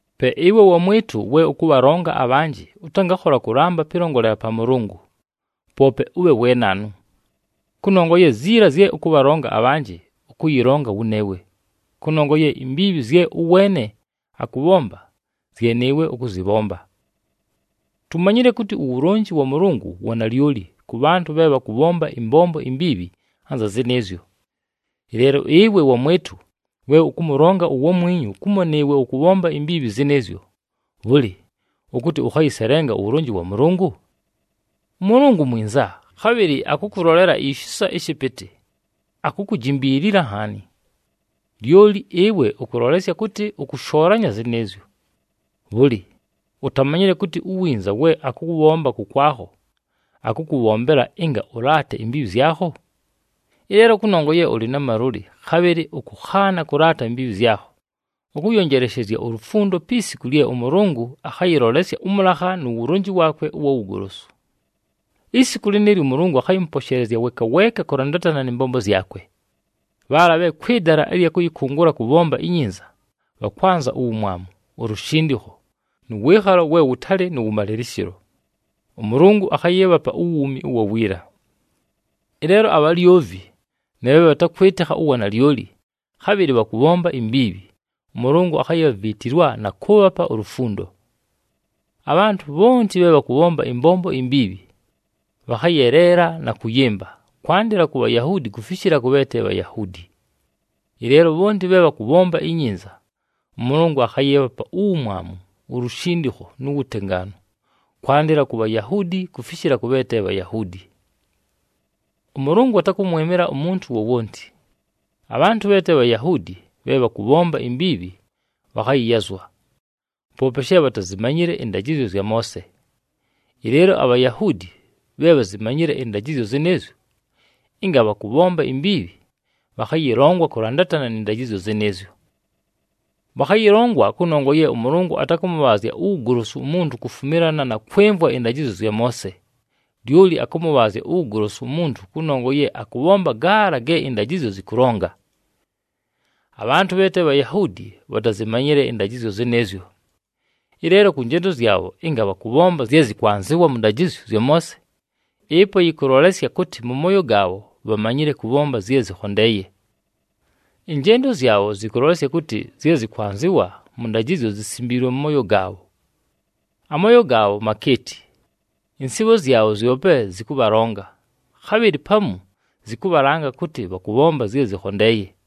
Pe ɨwe wamwɨtʉ, we ʉkʉbhalonga abhanjɨ, ʉtangakhola kʉlamba pɨlongolela pa Mʉlʉngʉ, poope ʉbhe we naanu. Kʉnongwa ye ziila zye ʉkʉbhalonga abhanjɨ, ʉkʉyɨlonga wʉneewe, kʉnongwa ye imbiibhi zye ʉweene akʉbhomba zye nɨɨwe ʉkʉzɨbhomba. Tumanyile kʉtɨ uwulonji wa Mʉlʉngʉ wa nalyoli kʉ bhantʉ bhe bhakʉbhomba ɨmbombo imbiibhi anza zɨnɨɨzyo. Ɨleelo, ɨwe wamwɨtʉ, we ʉkʉmʉlonga uwamwinyu kumo nɨɨwe ʉkʉbhomba imbiibhi zɨnɨɨzyo, bhʉlɨ ʉkʉtɨ ʉkhayɨselenga uwulonji wa Mʉlʉngʉ? ɄMʉlʉngʉ mwinza, khabhɨlɨ akʉkʉlolela ishisa ɨshɨpɨtɨ, akukujimbiilila nhaani. Lyoli ɨwe ʉkʉlolesya kʉtɨ ʉkʉshoolanya zɨnɨɨzyo. Bhʉlɨ, utamanyile kʉtɨ uwinza we akʉwʉbhomba kʉkwakho akʉkʉbhombela ɨnga ʉlaate imbiibhi zyakho? Ɨleelo kʉnongwa ye ʉlɨ na malʉlɨ, khabhɨlɨ ʉkʉkhaana kʉlaata imbiibhi zyakho, ʉkʉyonjeleshezya ulufundo pi siku lye ʉMʉlʉngʉ akhayɨlolesya ʉmʉlakha nu wulonji waakwe ʉwa wugolosu. Isiku lɨnɨɨlyo “ʉMʉlʉngʉ akhayɨmʉposheelezya weeka weeka kʉlandatana nɨ mbombo zyakwe.” Bhaala bhe kwɨ dala ɨlya kʉyɨkʉngʉla kʉbhomba inyinza, bhakwanza uwumwamu, ulushindikho, nʉ wɨɨkhalo we wʉtalɨ nʉ wʉmalɨlɨshɨlo, ʉMʉlʉngʉ akhayɨɨbhapa uwuumi ʉwa wiila. Ɨleelo, abhalyovi na bhe bhatakwɨtɨkha uwanalyoli, khabhɨlɨ bhakʉbhomba imbiibhi, ʉMʉlʉngʉ akhayibhaviitilwa na kʉʉbhapa ulufundo. Abhantʉ bhonti bhe bhakʉbhomba ɨmbombo imbiibhi, bhakhayeleela na kʉyɨmba, kwandɨla ku Bhayahuudi kufishila kʉ bhe te Bhayahuudi. Ɨleelo bhonti bhe bhakʉbhomba inyinza, ʉMʉlʉngʉ akhayɨɨbhapa uwumwamu, ulushindikho, nu wutengaanu, kwandɨla ku Bhayahuudi kufishila kʉ bhe te Bhayahuudi. ɄMʉlʉngʉ atakʉmwɨmɨla umuntu wowonti. Abhantʉ bhe te Bhayahuudi bhe bhakʉbhomba imbiibhi bhakhayɨyazwa, poope she bhatazimanyile ɨndajɨzyo zya Moose. Ɨleelo aBhayahuudi bhe bhazimanyile ɨndajɨzyo zɨnɨɨzyo, ɨnga bhakʉbhomba imbiibhi, bhakhayɨlongwa kʉlandatana nɨ ndajɨzyo zɨnɨɨzyo. Bhakhayɨlongwa kʉnongwa ye ʉMʉlʉngʉ atakʉmʉbhaazya uwugolosu umuntu kufumilana na kwɨmvwa ɨndajɨzyo zya Moose, lyoli akʉmʉbhaazya uwugolosu umuntu kʉnongwa ye akʉbhomba gaala ge ɨndajɨzyo zɨkʉlonga. Abhantʉ bhe te Bhayahuudi, bhatazimanyile ɨndajɨzyo zɨnɨɨzyo. Ɨleelo kʉ njendo zyabho ɨnga bhakʉbhomba zye zɨkwanzɨwa mʉ ndajɨzyo zya Moose, ɨpo yɨkʉlolesya kʉtɨ mʉ mooyo gaabho bhamanyile kʉbhomba zye zɨkhondeeye. Ɨnjendo zyabho zɨkʉlolesya kʉtɨ zye zɨkwanzɨwa mʉ ndajɨzyo zisimbiilwe mʉ mooyo gaabho. Amooyo gaabho makeeti, ɨnsɨɨbho zyabho zyope zɨkʉbhalonga, khabhɨlɨ pamu zɨkʉbhalanga kʉtɨ bhakʉbhomba zye zɨkhondeeye.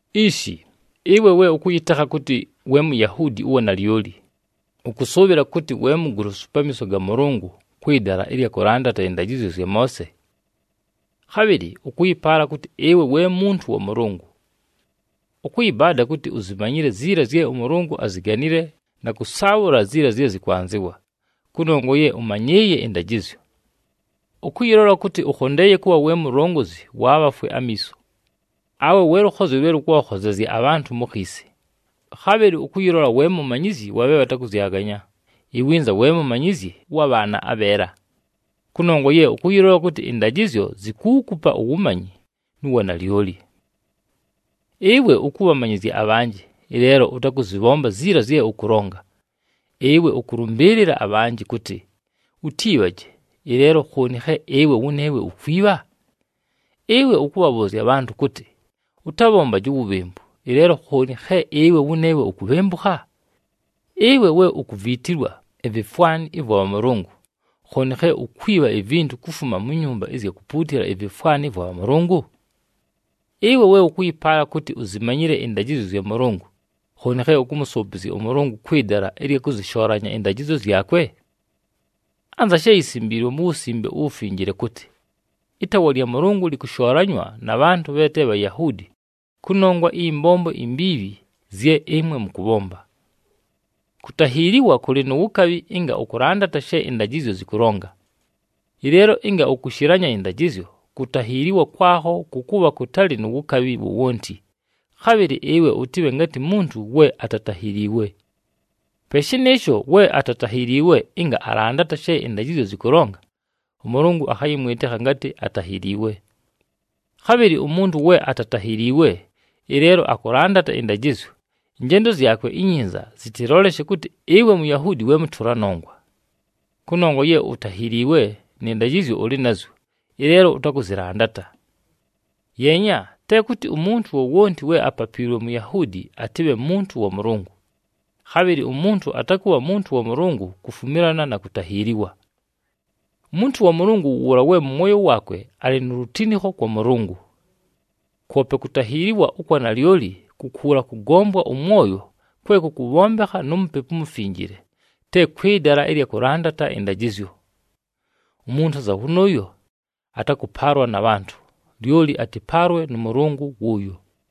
Ishi, ɨwe we ʉkʉyɨtekha kʉtɨ we Muyahuudi ʉwa nalyoli, ʉkʉsʉʉbhɨla kʉtɨ we mugolosu pamiiso ga Mʉlʉngʉ kwɨ dala ɨlya kʉlandata ɨndajɨzyo zya Moose. Khabhɨlɨ ʉkʉyɨpaala kʉtɨ ɨwe we muntu wa Mʉlʉngʉ. Ʉkʉyɨbaada kʉtɨ uzimanyile ziila zye ʉMʉlʉngʉ aziganile na kʉsaabhʉla ziila zye zɨkwanzɨwa, kʉnongwa ye ʉmanyɨɨye ɨndajɨzyo. Ʉkʉyɨlola kʉtɨ ʉkhondeeye kʉbha we mulongozi wa bhafwe amiiso, awe we lʉkhozyo lwe lʉkʉbhakhozezya abhantʉ mu khiisi. Khabhɨlɨ ʉkʉyɨlola we mumanyizyi wa bhe bhatakʉzyaganya, iwinza we mumanyizyi ʉwa bhaana abheela, kʉnongwa ye ʉkʉyɨlola kʉtɨ ɨndajɨzyo zikuukupa uwumanyi nu wanalyoli. Ɨwe ʉkʉbhamanyɨzya abhanjɨ, ɨleelo ʉtakʉzɨbhomba ziila zye ʉkʉlonga! Ɨwe ʉkʉlʉmbɨɨlɨla abhanjɨ kʉtɨ, “Utiibhaje,” ɨleelo khooni khe ɨwe wʉneewe ukwibha? Ɨwe ʉkʉbhabhʉʉzya abhantʉ kʉtɨ, “Ʉtabhombaje uwubhembu,” ɨleelo khooni khe ɨwe wʉneewe ukubhembukha? Ɨwe we ukuviitilwa ivifwani ɨvwa bhamʉlʉngʉ, khooni khe ukwibha ivintu kufuma mu nyumba ɨzya kupuutila ivifwani ɨvwa bhamʉlʉngʉ? Ɨwe we ʉkʉyɨpaala kʉtɨ uzimanyile ɨndajɨzyo zya Mʉlʉngʉ, khooni khe ʉkʉmʉsʉʉpɨzya ʉMʉlʉngʉ kwɨ dala ɨlya kʉzɨshoolanya ɨndajɨzyo zyakwe? Anza she yisimbiilwe mu Wusimbe uWufinjile kʉtɨ, “Ɨtaawa lya Mʉlʉngʉ lɨkʉshoolanywa na bhantʉ bhe te Bhayahuudi kʉnongwa ɨyɨ mbombo imbiibhi zye ɨmwe mʉkʉbhomba.” Kutahiiliwa kʉlɨ nu wukabhi ɨnga ʉkʉlandata she ɨndajɨzyo zɨkʉlonga. Ɨleelo ɨnga ʉkʉshɨlanya ɨndajɨzyo, kutahiiliwa kwakho kʉkʉbha kʉtalɨ nu wukabhi wowonti, khabhɨlɨ ɨwe ʉtɨbhe ngatɨ muntu we atatahiliiwe. Pe shɨnɨɨsho, we atatahiliiwe ɨnga alandata she ɨndajɨzyo zɨkʉlonga, ʉMʉlʉngʉ akhayɨmwɨtɨkha ngatɨ atahiliiwe. Khabhɨlɨ umuntu we atatahiliiwe, ɨleelo akʉlandata ɨndajɨzyo, ɨnjendo zyakwe inyinza zɨtɨlolesye kʉtɨ ɨwe Muyahuudi we mʉtʉla nongwa. Kʉnongwa ye utahiliiwe, nɨ ndajɨzyo ʉlɨ nazyo, ɨleelo ʉtakʉzɨlandata. Yeenya, te kʉtɨ umuntu wowonti we apapiilwe Muyahuudi atɨbhe muntu wa Mʉlʉngʉ, khabhɨlɨ umuntu atakʉbha muntu wa Mʉlʉngʉ kufumilana na kutahiiliwa. Umuntu wa Mʉlʉngʉ wʉ wʉʉla we mʉ mwoyo waakwe, alɨ nu lutinikho kwa Mʉlʉngʉ. Kwope kutahiiliwa ʉkwa nalyoli ku kuula kʉgombwa ʉmwoyo kwe kʉkʉbhombekha nu Mupepu uMufinjile, te kwɨ dala ɨlya kʉlandata ɨndajɨzyo. Umuntu anza wʉnʉʉyo, atakʉpaalwa na bhantʉ, lyoli atɨpaalwe nʉ Mʉlʉngʉ wʉʉyo.